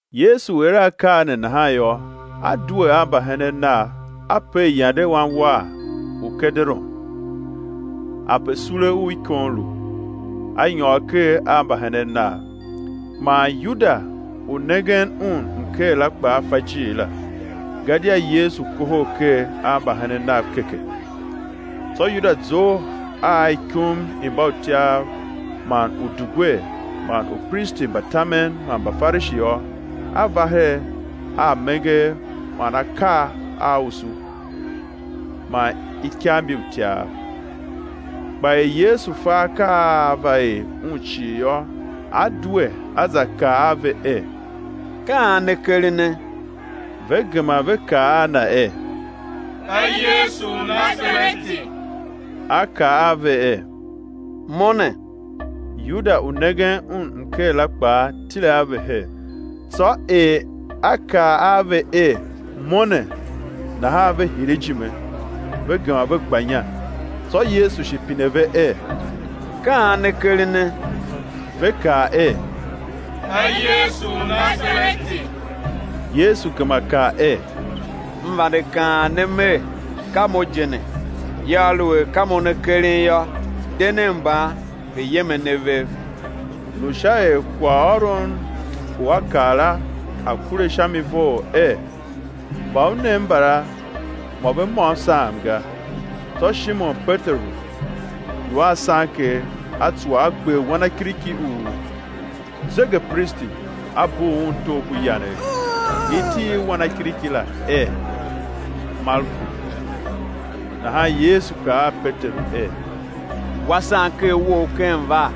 Yesu er akaa ne nahan yô, A due a mbahenen Nav, A per yande wanwagh u Kederon, ape sule u ikon lu, A nyôr ker a mbahenen Nav. Man Yuda u nengen Un mker la kpaa fa ijiir la, gadia Yesu kohol ker a mbahenen Nav keke. Tsô Yuda zough a ikum i mbautyav man udugwer man upristi mba tamen man Mbafarishi yô, a va her a amenger man akagh a usu man ikav mbi utyav. Kpa er Yesu fa akaa a á va er Un cii yô, A due A za kaa a ve er: Ka an ne kerene? Ve gema ve kaa a Na er: Ka Yesu u Nasareti. A kaa a ve er: Mo ne. Yuda u nengen Un mker la kpaa, tile a ve her. Tsô er A kaa a ve er: Mo ne, nahan ve hire ijime, ve gema ve gba inya. Tsô Yesu shi pine ve er: Ka an ne kerene? Ve kaa er: Ka Yesu u Nasareti. Yesu gema kaa er: M vande kaan ne Mer: Ka Mo je ne; yô, aluer ka Mo ne keren yô, de nen mban, ve̱ yem a ne vev. Lu sha er kwaghôron u A kaa la a̱ kure sha mi vough er: Mba U nem mbala, mô ve môm saam ga. Tsô Shimon Peteru lu a sanker, a tsuwa, a gber wanakiriki u zegepristi, a bugh un togh ku yanegh. Iti i wanakiriki la er Malku. Nahan Yesu kaa a Peteru er: Wa sanker wou ken var.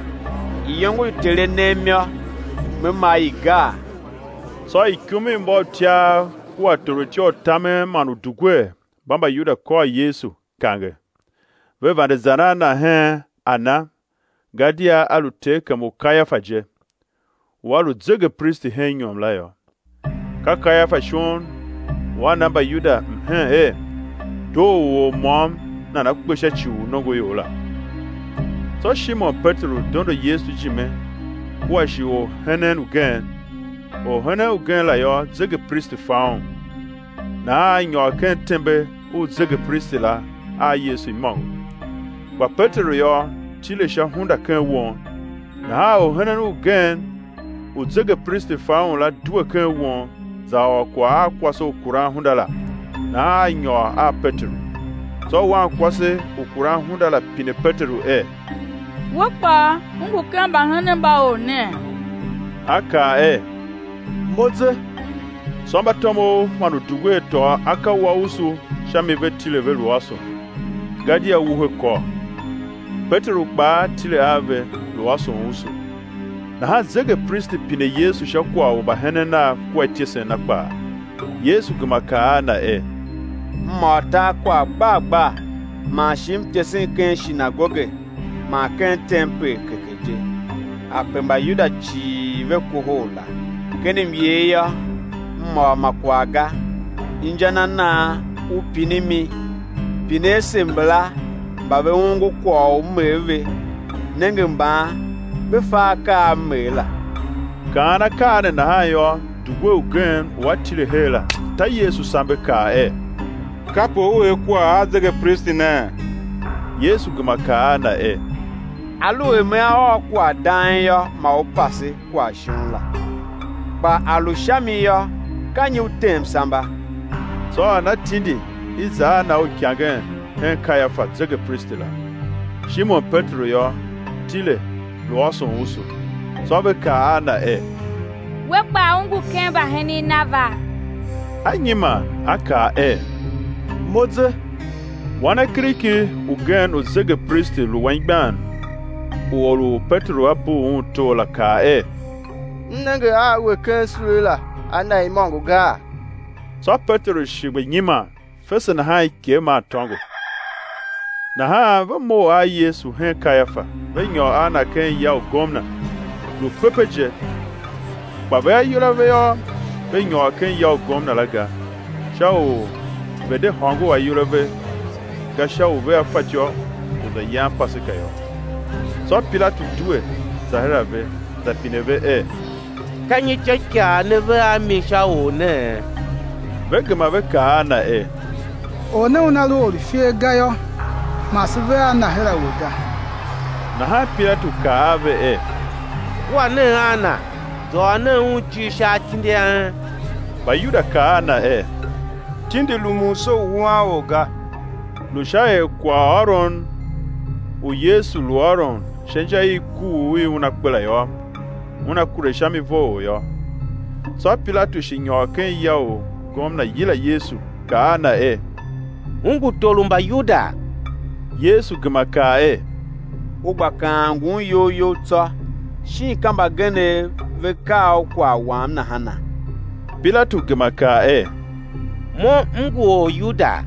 Iyongo i Ter A nem yô, Me ma i gaa? Tsô ikum i mbautyav kua torutya u tamen man udugwer mba Mbayuda kôr Yesu, kange, ve vande zan a Na hen Ana; gadia a lu terkem u Kayafa je, u a lu zegepristi hen inyom la yô. Ka Kayafa shon u a na Mbayuda mhen er, doo u or môm nana̱ kpe sha ci u nongoior la. Tsô Shimon Peteru dondo Yesu ijime kua shi orhenen ugen. Orhenen ugen la yô, zegepristi fa un; nahan a nyôr ken tembe u zegepristi la a Yesu imôngo. Kpa Peteru yô, tile sha hunda ken won. Nahan orhenen ugen u zegepristi fa un la, due ken won, za ôr kwagh a kwase u kuran hunda la, nahan a nyôr a Peteru. Tsô wankwase u kuran hunda la, pine Peteru er: We kpaa, u ngu ken mbahenen mba Or nee? A kaa er: Mo ze. Tsô mbatomov man udugwer tôô aka wa usu sha mi ve tile ve lu ôson, gadia wuhe kôr. Peteru kpaa tile a ve, lu ôson usu. Nahan zegepristi pine Yesu sha kwagh u mbahenen Nav kua ityesen Na kpaa. Yesu gema kaa a na er: M ôr tar kwagh gbar gbar; man shi M tesen ken shinagoge man ken tempel keke je, ape Mbayuda cii ve kohol la, ken myer yô, M ôr ma kwagh ga. Inja na nan u pinimi? Pine ase mbala mba ve ongo kwagh u M er ve, nenge mban ve fa akaa a M er la. Kaan akaa ne nahan yô, dugwer ugen u a tile her la, ta Yesu sambe, kaa er: Kape U er kwagh a zegepristi nee? Yesu gema kaa a na er: Aluer Mea ôr kwagh dang yô, ma u pase kwagh shon la; kpa a lu sha mi yô, ka nyi u tem samba? Tsô Ana tindi i̱ za a Na uikangen hen Kayafa, zegepristi la. Shimon Peteru yô, tile, lu ôson usu. Tsô ve kaa a na er: We kpaa u ngu ken mbahenen Nava? A nyiman, a ka er: Mo ze. Wanakiriki ugen u zegepristi lu anmgbian u or u Peteru a bugh un togh la kaa er: M nenge a we ken sule la a Na imôngo gaa? Tsô Peteru shi gba nyiman; fese nahan ikegh maa tôngo. Nahan ve mough a Yesu hen Kayafa, ve nyôr a Na ken ya u gomna; lu pepe je; kpa ve ayol a ve yô, ve nyôr ken ya u gomna la ga, sha u ve̱ de hôngor ayol a ve ga, sha u vea fatyô u za yan Paseka yô. Tsô Pilatu due za her a ve, za pine ve er: Ka nyi ityôikaa ne ve a mi sha Or nee? Ve gema ve kaa a na er: Or ne Una lu or u ifer ga yô, ma se ve a Na her a we ga. Nahan Pilatu kaa a ve er: Kua nen a Na, za ôr nen Un ijir sha atindi a en. Mbayuda kaa a Na er: Tindi rumun se u wuan or ga; lu sha er kwaghôron u Yesu lu ôron sha inja i kuugh i Una kpe la yô, una kure sha mi vough yô. Tsô Pilatu shi nyôr ken ya u gomna, yila Yesu, kaa a Na er: U ngu tor u Mbayuda? Yesu gema kaa er: U gba kaan ngun iyol you tsô, shin ka mbagenev ve kaa u kwagh Wam nahana? Pilatu gema kaa er: Mo m ngu Oryudaa?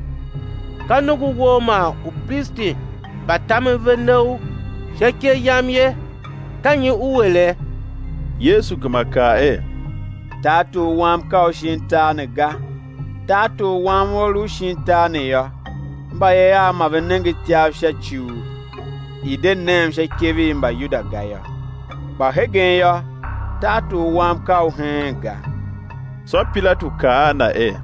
Ka nongo Wou man upristi mba tamen ve ne U sha ikev yam ye; ka nyi U ere? Yesu gema kaa er: Tartor Wam ka u shin tar ne ga. Tartor Wam ua lu u shin tar ne yô, mbayev Av ma ve nenge ityav sha u i̱ de nem sha ikev i Mbayuda ga yô; kpa hegen yô, tartor Wam ka u heen ga. Tsô Pilatu kaa a Na er: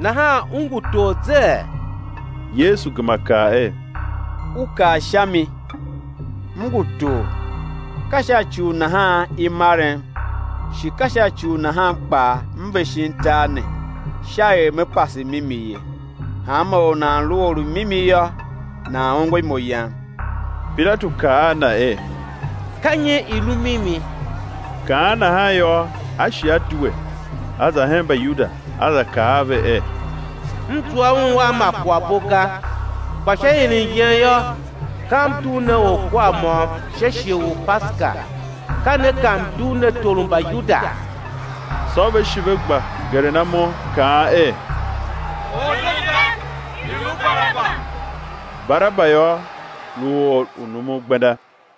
Nahan U ngu tor zee? Yesu gema kaa er: U kaa sha mi, M ngu tor. Ka sha ci u nahan i marem, shi ka sha ci u nahan kpaa M ve shin tar ne, sha er Me pase mimi ye. Hanma or u nan lu or u mimi yô, nan ongo imo Yam. Pilatu kaa a Na er: Ka nyi i lu mimi? Kaan nahan yô, a shi a due, a za hen Mbayuda, a za kaa a ve er: M zua Un a ma kwaghbo ga. Kpa sha ieren yen yô, ka m dugh ne orkwar môm sha shighe u Paseka. Ka ne ka m̱ dugh ne tor u Mbayuda? Tsô ve shi ve gba geren imo, kaan er: Or ne ga, i̱ lu Baraba! Baraba yô, lu or u numun gbenda.